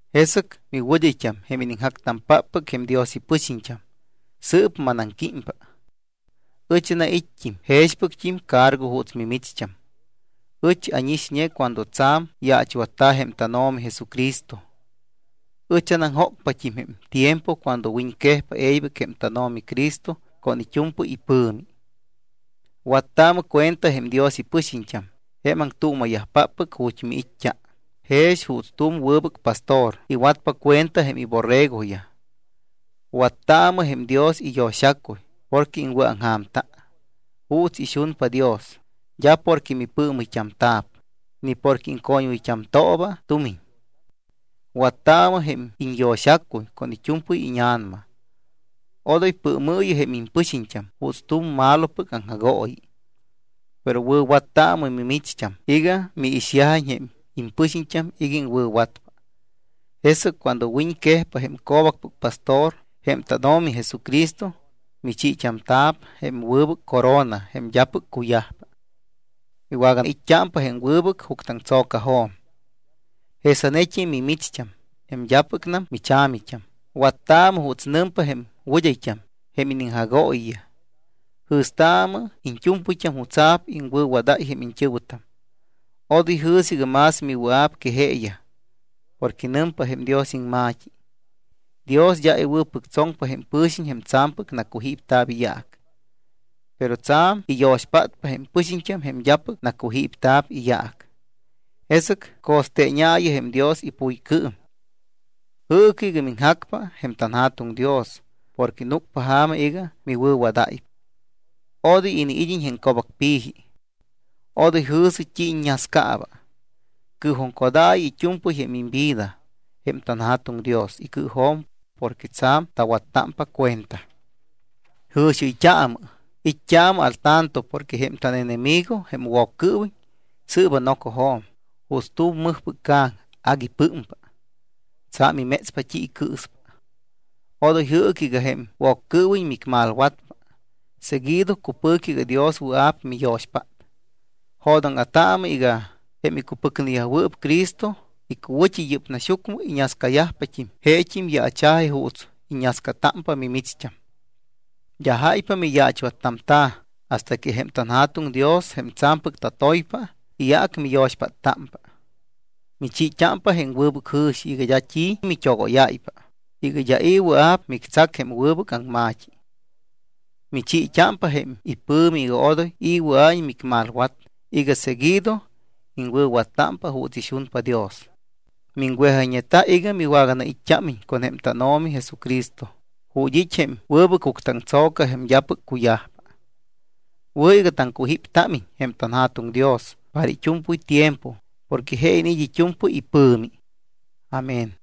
Jesɨc miwɨd́ayt́am, jém iniŋjactampáppɨc jém Dios ipɨxiñt́am, sɨɨp manaŋquímpa. Ɨch anait́t́im jexpɨct́im cargo juuts mimicht́am. Ɨch ánixñe cuando tsa̱m yaachwatta̱ jém tánO̱mi Jesucristo. Ɨch anaŋjócpat́im jém tiempo cuando wiñquejpa e̱ybɨc jém tánO̱mi Cristo con it́u̱mpɨy ipɨ̱mi. Wattaamɨ cuenta jém Dios ipɨxiñt́am jém aŋtuuma̱yajpáppɨc ju̱t́ miit́t́a, jex juuts tu̱m wɨbɨc pastor iwatpa cuenta jém iborregoyaj. Wattaamɨ jém Dios iyo̱xacuy porque iŋwɨ̱aŋja̱mta, juuts ixunpa Dios, d́a porque mipɨɨmɨyt́amta̱p, ni porque iŋcoñwɨyt́amtooba tumiñ. Wattaamɨ jém iñyo̱xacuy con it́u̱mpɨy íña̱nama. Odoy pɨɨmɨɨyɨ jém impɨxiñt́am juuts tu̱m malopɨc aŋjagooyi. Pero wɨ̱wattaamɨ mimicht́am iga miixyajiñ jém impɨxiñt́am iga iŋwɨ̱watpa. Jesɨc cuando wiñquejpa jém Co̱bacpɨc Pastor, jém tánO̱mi Jesucristo, michiit́amta̱p jém wɨbɨc corona jém d́apɨc cuyajpa. Miwagait́t́ámpa jém wɨbɨc juctɨaŋtso̱cajo̱m. Jesanet́im mimicht́am jém d́apɨcnam micha̱mit́am, wattaamɨ juuts nɨmpa jém wɨd́ayt́am jém iniŋjagooyiyaj. Jɨ̱staamɨ iñt́u̱mpɨyt́am jutsa̱p iŋwɨ̱wadáy jém iñt́ɨ̱wɨtam. Odoy jɨ̱sɨ iga más miwɨa̱p que jeeyaj. Porque nɨmpa jém Dios iŋma̱t́i: Dios d́a iwɨ̱pɨctsoŋpa jém pɨxiñt́am jém tsa̱mpɨc nacujípta̱p iyaac, pero tsa̱m iyo̱xpátpa jém pɨxiñt́am jém d́apɨc nacujípta̱p iyaac. Jesɨc co̱steeñaayɨ jém Dios ipuycɨɨm. Jɨɨcɨ iga miŋjacpa jém tanJa̱tuŋ Dios porque núcpa ja̱ma iga miwɨ̱wadáypa. Odoy iniid́iñ jém co̱bacpi̱ji. Odoy jɨ̱sɨ t́i iññascaaba. Cɨɨjuŋcodaayɨ it́u̱mpɨy jém imvida jém tanJa̱tuŋ Dios icɨɨjo̱m porque tsa̱m tawattámpa cuenta. Jɨ̱xiɨyt́aamɨ, it́t́aamɨ al tanto porque jém tánenemigo jém Woccɨɨwiñ sɨɨba nocojo̱m juuts tu̱m mɨjpɨc ca̱ŋ agui pɨ́mpa. Tsa̱m imétspa t́i icɨɨspa. Odoy jɨɨcɨ iga jém Woccɨɨwiñ micmalwatpa. Seguido cupɨ̱cɨ iga Dios wɨa̱p miyo̱xpát. Jo̱dóŋa̱taamɨ iga jém icupɨcneyajwɨɨp Cristo icuwɨ̱t́i yɨ́p naxyucmɨ, iñascayajpat́im jeet́im yaacha̱ji juuts iññascatámpa mimicht́am. D́a jáypa miyaachwattamta̱ hasta que jém tanJa̱tuŋ Dios, jém tsa̱mpɨc tatoypa, iyaac miyo̱xpáttámpa. Michiit́ámpa jém wɨbɨc jɨ̱xi iga d́a t́i mit́ogóyáypa, iga d́a i̱ wɨa̱p mictsac jém wɨbɨc aŋma̱t́i. Michiit́ámpa jém ipɨ̱mi iga odoy i̱ wɨa̱iñ micmalwat iga seguido iŋwɨ̱wattámpa juuts ixunpa Dios. Miŋwejayñeta iga miwagait́t́ámiñ con jém tánO̱mi Jesucristo ju̱t́ it́ jém wɨbɨc juctɨaŋtso̱ca jém d́apɨc cuyajpa. Wɨ̱ iga taŋcujíptámiñ jém tanJa̱tuŋ Dios para it́u̱mpɨy tiempo porque je iniit́ it́u̱mpɨy ipɨ̱mi. Amén.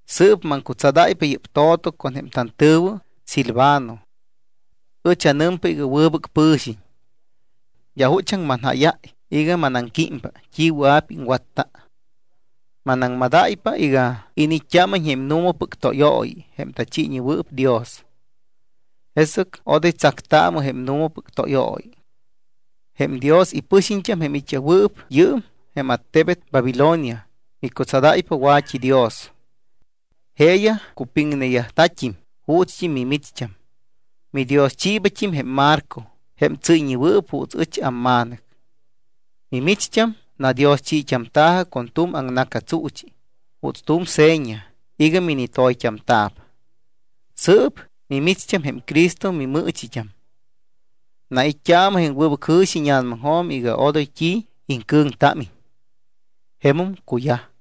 Sɨɨp maŋcutsadáypa yɨ́p to̱to con jém tantɨ̱wɨ Silvano. Ɨch anɨmpa iga wɨbɨc pɨ̱xiñ. D́a juchaŋ manjáyáy iga manaŋquímpa t́i wɨa̱p iŋwatta. Manaŋmadáypa iga iniit́t́ámiñ jém nu̱mapɨc tóyooyi jém tachiiñewɨɨp Dios. Jesɨc odoy tsactaamɨ jém nu̱mapɨc tóyooyi. Jém Dios ipɨxiñt́am, jém it́yajwɨɨp yɨɨm jém attebet Babilonia, micutsadáypa wa̱t́idios. Jeeyaj cupiŋneyajta̱t́im juuts mimicht́am. Midioschiibat́im jém Marco jém tsɨ́yñewɨɨp juuts ɨch amma̱nɨc. Mimicht́am nadioschit́amta̱jɨ con tu̱m aŋna̱catsuuchi juuts tu̱m seña iga minitoyt́amta̱p. Sɨɨp mimicht́am jém Cristo mimɨɨchit́am. Nait́t́aamɨ jém wɨbɨc jɨ̱xi íña̱namaŋjo̱m iga odoy t́i iŋcɨ̱ŋtámiñ. Jemum cuyaj.